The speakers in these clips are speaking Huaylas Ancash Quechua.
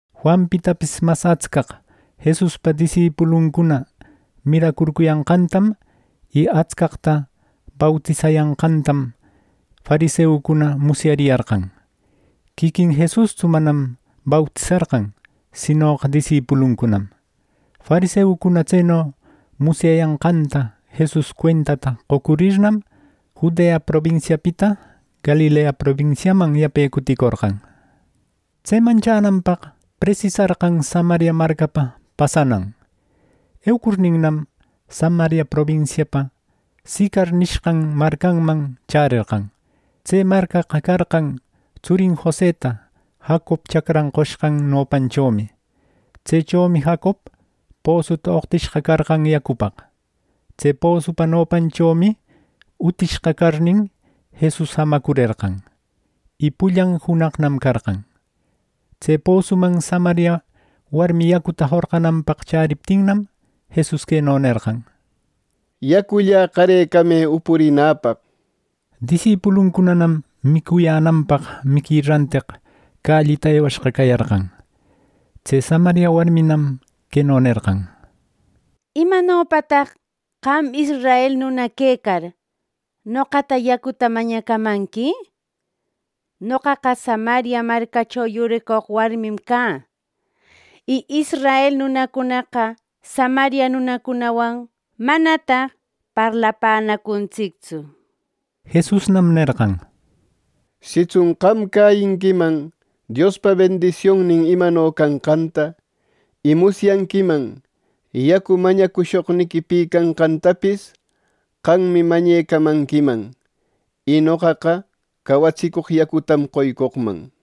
Juanpitapis mas atscaq Jesuspa disipuluncuna miracurcuyanqantam y atscaqta bautisayanqantam fariseucuna musyariyarqan. (Quiquin Jesustsu manam bautisarqan sinoqa disipuluncunam.) Fariseucuna tseno musyayanqanta Jesus cuentata qocurirnam, Judea probinsiapita Galilea probinsiaman yape cuticorqan. Tseman chänanpaq presisarqan Samaria marcapa pasanan. Eucurninnam, Samaria probinsiapa Sicar nishqan marcanman chärerqan. Tse marcaqa carqan tsurin Joseta Jacob chacran qoshqan nopanchomi. Tsechomi Jacob posuta oqtishqa carqan yacupaq. Tse posupa nopanchomi utishqa carnin, Jesus jamacurerqan. Y pullan junaqnam carqan. Tse posuman Samaria warmi yacuta jorqunanpaq chäriptinnam, Jesus queno nerqan: —Yacullä qarecamë upurinäpaq —nir. Disipuluncunanam micuyänanpaq miqui ranteq callita ewayashqa cayarqan. Tse Samaria warminam queno nerqan: —¿Imanopataq qam israel nuna quecar, noqata yacuta mañacamanqui? Noqaqa Samaria marcacho yuricoq warmim cä. Y israel nunacunaqa Samaria nunacunawan manataq parlapänacuntsictsu —nir. Jesusnam nerqan: —Sitsun qam cäyinquiman Diospa bendisionnin imano canqanta, y musyanquiman yacu mañacushoqniqui pi canqätapis; qammi mañaquecamanquiman, y noqaqa cawatsicoq yacutam qoycoqman —nir.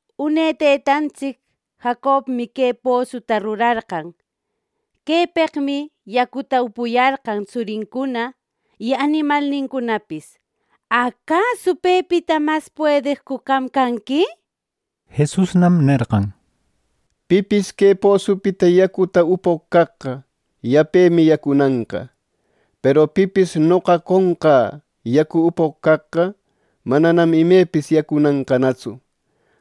Une tëtantsic Jacobmi que posuta rurarqan. Quepeqmi yacuta upuyarqan tsurincuna y animalnincunapis. ¿Acasu pepita mas puedeqcu qam canqui! —nir. Jesusnam nerqan: —Pipis que posupita yacuta upoq caqqa, yapemi yacunanqa. Peru pipis noqa qonqä yacu upoq caqqa, mananam imepis yacunanqanatsu.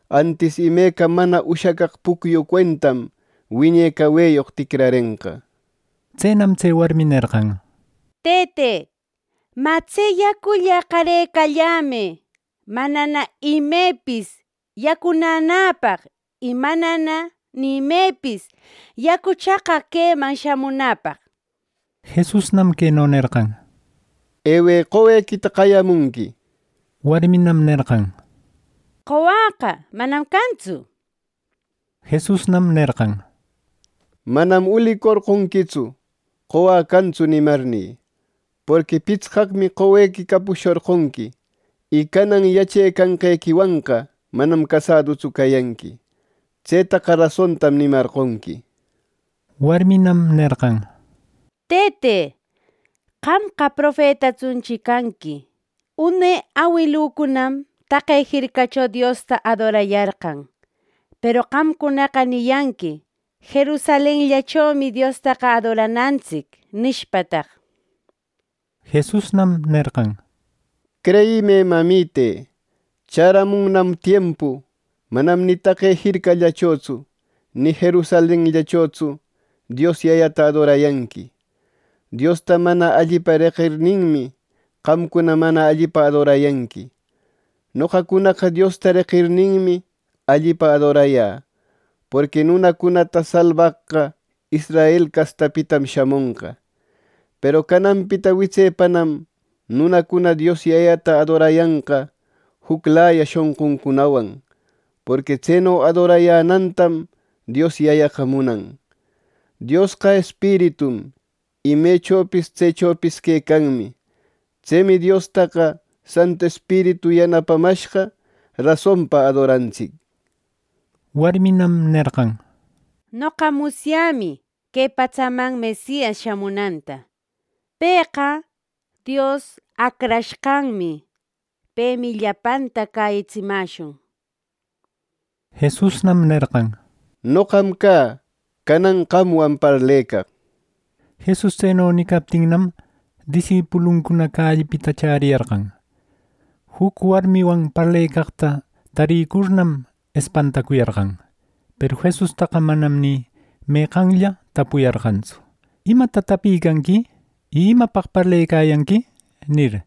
Antis imeca mana ushacaq pucyu cuentam wiñe caweyoq ticrarenqa —nir. Tsenam tse warmi nerqan: —Tëte, mä tse yacullä qarecallämë manana imepis yacunänäpaq y manana ni imepis yacu chaqaq queman shamunäpaq —nir. Jesusnam queno nerqan: —Ewë qowequita qayamunqui —nir. Warminam nerqan: —Qowäqa manam cantsu —nir Jesusnam nerqan: —Manam ulicorqonquitsu: ‘Qowä cantsu’ nimarnï. Porqui pitsqaqmi qowequi capushorqonqui, y canan yachecanqequiwanqa manam casadutsu cayanqui. Tsetaqa rasontam nimarqonqui —nir. Warminam nerqan: —Tëte, qamqa profetatsunchi canqui. Une awilücunam taqe jircacho Diosta adorayarqan. Peru qamcunaqa niyanqui: ‘Jerusalenllachomi Diostaqa adoranantsic’ nishpataq. Jesusnam nerqan: —Creyimë, mamite. Chäramunnam tiempu manam ni taqe jircallachotsu ni Jerusalenllachotsu Dios Yayata adorayanqui. Diosta mana allipa reqirninmi, qamcuna mana allipa adorayanqui. Noqacunaqa Diosta reqirninmi, allipa adorayä, porqui nunacunata salbaqqa israel castapitam shamonqa. Peru cananpita witsepanam nunacuna Dios Yayata adorayanqa juclaya shonquncunawan, porqui tseno adorayänantam Dios Yayaqa munan. Diosqa Espiritum, y mecho tsechopis quecanmi. Tsemi Diostaqa Santu Espiritu yanapamashqa rasonpa adoranantsic —nir. Warminam nerqan: —Noqa musyämi que patsaman Mesias shamunanta. (Pëqa Dios Acrashqanmi.) Pemi llapanta cäyitsimäshun —nir. Jesusnam nerqan: —Noqam cä, canan qamwan parlecaq. Jesus tseno nicaptinnam, disipuluncuna callipita chäriyarqan. Juc warmiwan parlecaqta tarïcurnam espantacuyarqan. Peru Jesustaqa manam ni meqanlla tapuyarqantsu “¿Imata tapicanqui?” y “¿Imapaq parlecayanqui?” nir.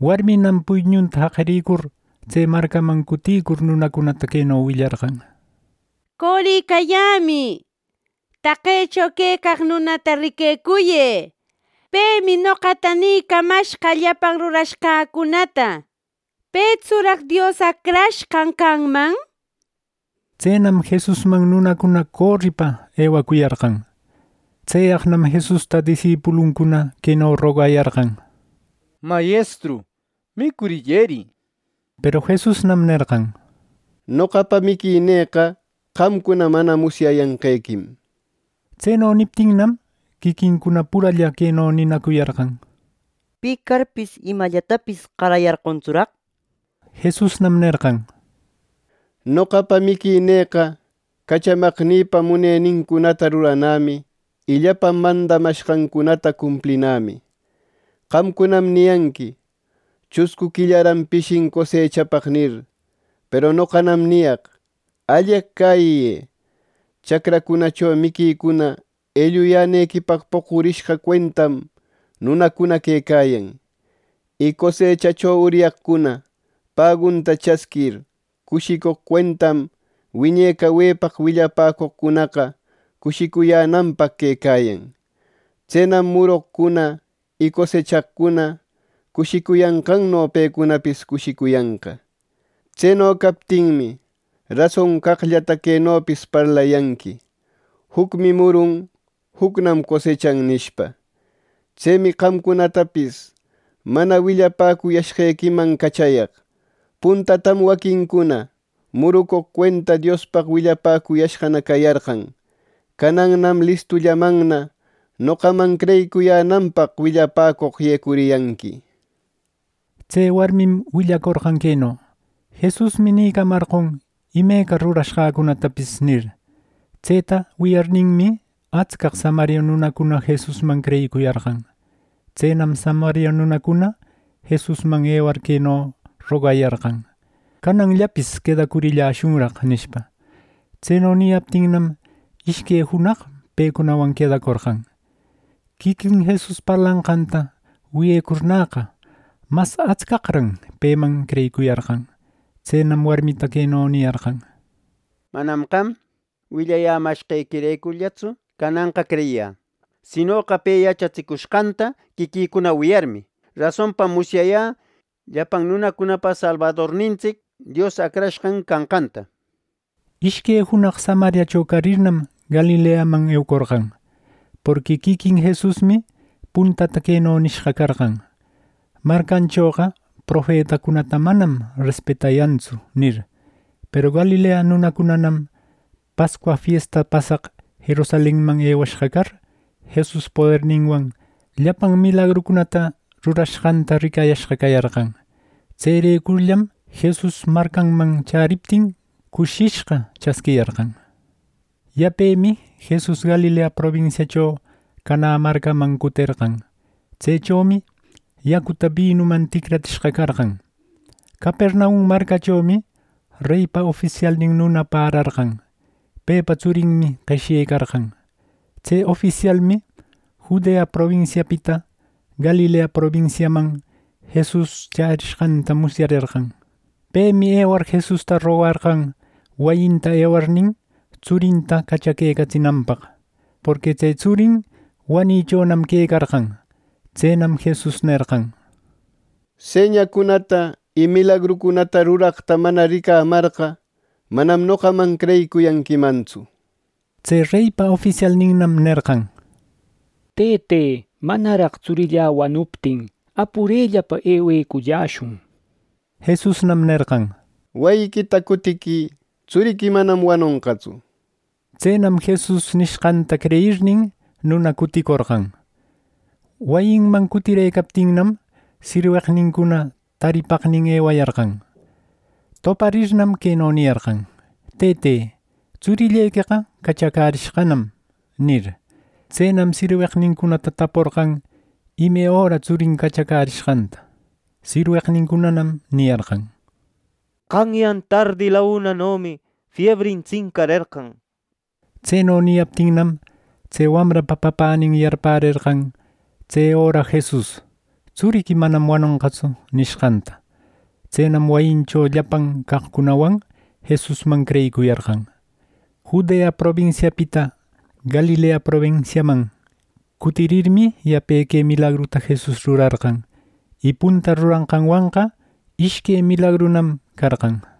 Warminam puyñunta jaqiricur, tse marcaman cuticur, nunacunata queno willarqan: —¡Coricayämï! ¡Taqecho quecaq nunata riquecuyë! ¡Pemi noqata nïcamashqa llapan rurashqäcunata! ¿Petsuraq Dios Acrashqan canman? —nir. Tsenam, Jesusman nunacuna coripa ewacuyarqan. Tseyaqnam Jesusta disipuluncuna queno rogayarqan: —Mayestru, micurillëri —nishpa. Peru Jesusnam nerqan: —Noqapa miquinïqa qamcuna mana musyayanqequim —nir. Tseno niptinnam, quiquincuna puralla queno ninacuyarqan: —¿Pi carpis imallatapis qarayarqontsuraq? —nishpa. Jesusnam nerqan: —Noqapa miquinïqa cachamaqnïpa munenincunata ruranämi y llapan mandamashqancunata cumplinämi. Qamcunam niyanqui: ‘Chuscu quillaran pishin cosechapaq’ nir. Peru noqanam niyaq: Alleq cäyiyë. Chacracunacho miquicuna elluyänequipaq poqurishqa cuentam nunacuna quecayan. Y cosechacho uryaqcuna pagunta chasquir, cushicoq cuentam wiñe cawepaq willapäcoqcunaqa cushicuyänanpaq quecayan. Tsenam murucoqcuna y cosechaqcuna cushicuyanqanno, pecunapis cushicuyanqa. Tseno captinmi, rason caqllata quenopis parlayanqui: ‘Jucmi murun, jucnam cosechan’ nishpa. Tsemi qamcunatapis mana willapäcuyashqequiman cachayaq. Puntatam waquincuna murucoq cuenta Diospaq willapäcuyashqana cayarqan. Canannam listullamanna noqaman creyicuyänanpaq willapäcoq yecuriyanqui —nir. Tse warmim willacorqan queno: “Jesusmi nicamarqon imeca rurashqäcunatapis” nir. Tseta wiyarninmi, atscaq Samaria nunacuna Jesusman creyicuyarqan. Tsenam Samaria nunacuna Jesusman ewar queno rogayarqan: “Cananllapis quedacurilläshunraq” nishpa. Tseno niyaptinnam, ishque junaq pecunawan quedacorqan. Quiquin Jesus parlanqanta wiyecurnäqa, mas atscaqran peman creyiquicuyarqan. Tsenam warmita queno niyarqan: —Manam qam willayämashqequirecurllatsu cananqa creyiyä. Sinoqa pe yachatsicushqanta quiquïcuna wiyarmi, rasonpa musyayä llapan nunacunapa salbadornintsic Dios Acrashqan canqanta. Ishque junaq Samariacho carirnam, Galileaman eucorqan. Porqui quiquin Jesusmi puntata queno nishqa carqan: “Marcanchoqa profetacunata manam respetayantsu” nir. Peru Galilea nunacunam Pascua fiesta pasaq Jerusalenman ewashqa car, Jesus poderninwan llapan milagrucunata rurashqanta ricayashqa cayarqan. Tserecurllam Jesus marcanman chäriptin, cushishqa chasquiyarqan. Yapemi Jesus Galilea probinsiacho Canä marcaman cuterqan. Tsechomi yacuta binuman ticratsishqa carqan. Capernaum marcachomi reypa ofisialnin nuna pärarqan. Pepa tsurinmi qeshyecarqan. Tse ofisialmi Judea probinsiapita Galilea probinsiaman Jesus chärishqanta musyarerqan. Pemi ewar Jesusta rogarqan wayinta ewarnin tsurinta cachaquecatsinanpaq, porqui tse tsurin wanichonam quecarqan. Tsenam Jesus nerqan: —Señacunata y milagrucunata ruraqta mana ricamarqa, manam noqaman creyicuyanquimantsu —nir. Tse reypa ofisialninnam nerqan: —Tëte, manaraq tsurïlla wanuptin, apurellapa eweculläshun —nir. Jesusnam nerqan: —Wayiquita cutiquï. Tsuriqui manam wanonqatsu —nir. Tsenam Jesus nishqanta creyirnin, nuna cuticorqan. Wayinman cuticurëcaptinnam, sirweqnincuna taripaqnin ewayarqan. Toparirnam queno niyarqan: —Tëte, tsurillequeqa cachacärishqanam —nir. Tsenam sirweqnincunata taporqan ime öra tsurin cachacärishqanta. Sirweqnincunanam niyarqan: —Qanyan tardi launanomi fiebrin tsincarerqan —nir. Tseno niyaptinnam, tse wamrapa papänin yarpärerqan tse öra Jesus “Tsuriqui manam wanonqatsu” nishqanta. Tsenam wayincho llapan caqcunawan Jesusman creyicuyarqan. Judea probinsiapita Galilea probinsiaman cutirirmi, yape que milagruta Jesus rurarqan. Y punta ruranqanwanqa ishque milagrunam carqan.